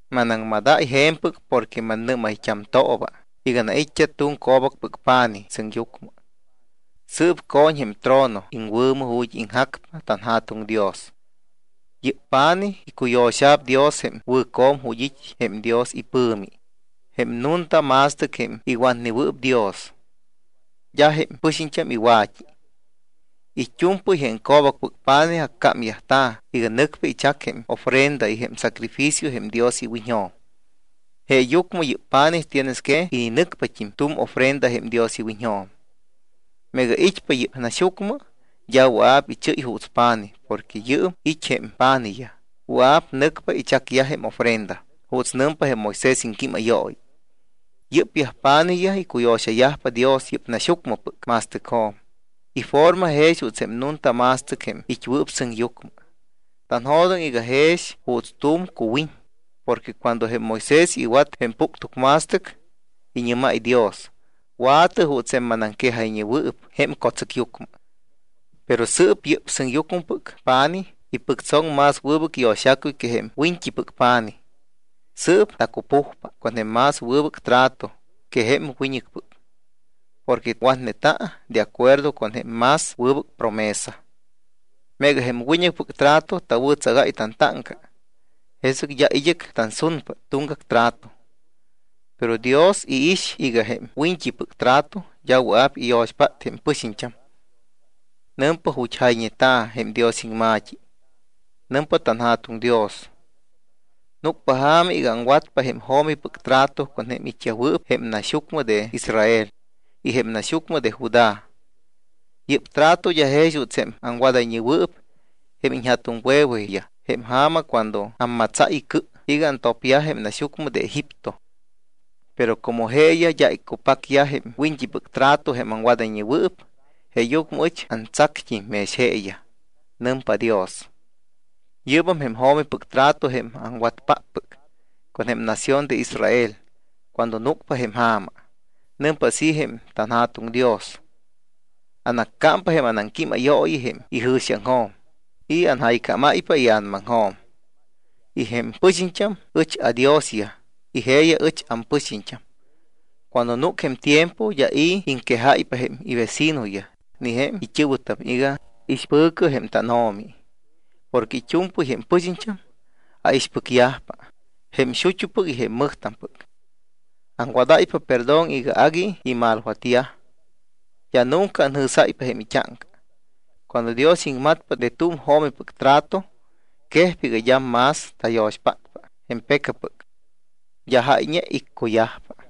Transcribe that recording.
Manaŋmadáy je̱mpɨc porque mannɨ́mayt́amtooba iga tanait́t́a tu̱m co̱bacpɨc pa̱nij sɨŋyucmɨ. Sɨɨp co̱ñ jém trono iŋwɨ̱mɨ ju̱t́ iŋjacpa tanJa̱tuŋ Dios. Yɨ́p pa̱nij icuyo̱xa̱p Dios jém wɨ̱co̱m ju̱t́ it́ jém Dios ipɨ̱mi, jém nunta ma̱stɨc jém iwatnewɨɨp Dios. D́a jém pɨxiñt́am iwa̱t́i. It́u̱mpɨy jém co̱bacpɨc pa̱nij accámyajta̱ iga nɨcpa ichac jém ofrenda y jém sacrificio jém Dios iwiñjo̱m. Jeeyucmɨ yɨ́p pa̱nij tienes que ininɨcpat́im tu̱m ofrenda jém Dios iwiñjo̱m. Meega it́pa yɨ́p naxyucmɨ, d́a wɨa̱p ichɨ́y juuts pa̱nij porque yɨɨm it́ jém pa̱nijyaj, wɨa̱p nɨcpa ichacyaj jém ofrenda juuts nɨmpa jém Moisés iŋquímayooyi. Yɨ́pyaj pa̱nijyaj icuyo̱xayajpa Dios yɨ́p naxyucmɨpɨc ma̱stɨcjo̱m, iforma jex juuts jém nunta ma̱stɨc jém it́wɨɨp sɨŋyucmɨ. Tanjo̱doŋ iga jex juuts tu̱m cuwiñ porque cuando jém Moisés iwat jém puctucma̱stɨc, iñɨ́máy Dios: “Wa̱tɨ juuts jém manaŋquejayñewɨɨp jém co̱tsɨcyucmɨ.” Pero sɨɨp yɨ́p sɨŋyucmɨpɨc pa̱nij ipɨctsoŋ más wɨbɨc yo̱xacuy que jém wiñt́ipɨc pa̱nij. Sɨɨp tacupujpa con jém más wɨbɨc trato que jém wiñɨcpɨc porque watneta̱ de acuerdo con jém más wɨbɨc promesa. Meega jém wiñt́ipɨc trato tawɨ̱tsagáy tantáŋca, jesɨc d́a id́ɨc tansunpa tuŋgac trato. Pero Dios iix iga jém wiñt́ipɨc trato d́a wɨa̱p iyo̱xpát jém pɨxiñt́am. Nɨmpa ju̱t́ jayñeta̱ jém Dios iŋma̱t́i: Nɨmpa tanJa̱tuŋ Dios: Núcpa ja̱ma iga aŋwatpa jém jo̱mipɨc trato con jém it́yajwɨɨp jém naxyucmɨ de Israel y jém naxyucmɨ de Judá. Yɨ́p trato d́a jex juuts jém aŋwadayñewɨɨp jém ija̱tuŋwe̱weyaj jém ja̱ma cuando ammatsáy icɨ iga antopyaj jém naxyucmɨ de Egipto. Pero como jeeyaj d́a iccupacyaj jém wiñt́ipɨc trato jém aŋwadayñewɨɨp, jeeyucmɨ ɨch antsact́im mex jeeyaj, nɨmpa Dios. Yɨ́bam jém jo̱mipɨc trato jém aŋwatpáppɨc con jém nación de Israel cuando núcpa jém ja̱ma. Nɨmpa así jém tanJa̱tuŋ Dios: Anaccámpa jém anaŋquímayooyi jém ijɨ̱xiaŋjo̱m y anjaycámáypa ia̱namaŋjo̱m. Y jém pɨxiñt́am ɨch aDiosyaj. Y jeeyaj ɨch ampɨxiñt́am. Cuando núc jém tiempo, d́a i̱ iŋquejáypa jém ivecinoyaj ni jém it́ɨ̱wɨtam iga: Ixpɨ̱cɨ jém tánO̱mi. Porque it́u̱mpɨy jém pɨxiñt́am aixpɨcyajpa jém xut́upɨc y jém mɨjtampɨc. Aŋwadáypa perdón iga agui imalwatneyaj. D́a nunca anjɨ̱sáypa jém it́áŋca. Cuando Dios iŋmatpa de tu̱m jo̱mipɨc trato, quejpa iga d́am más tayo̱xpátpa jém pecapɨc, d́a jáyñe iccuyajpa.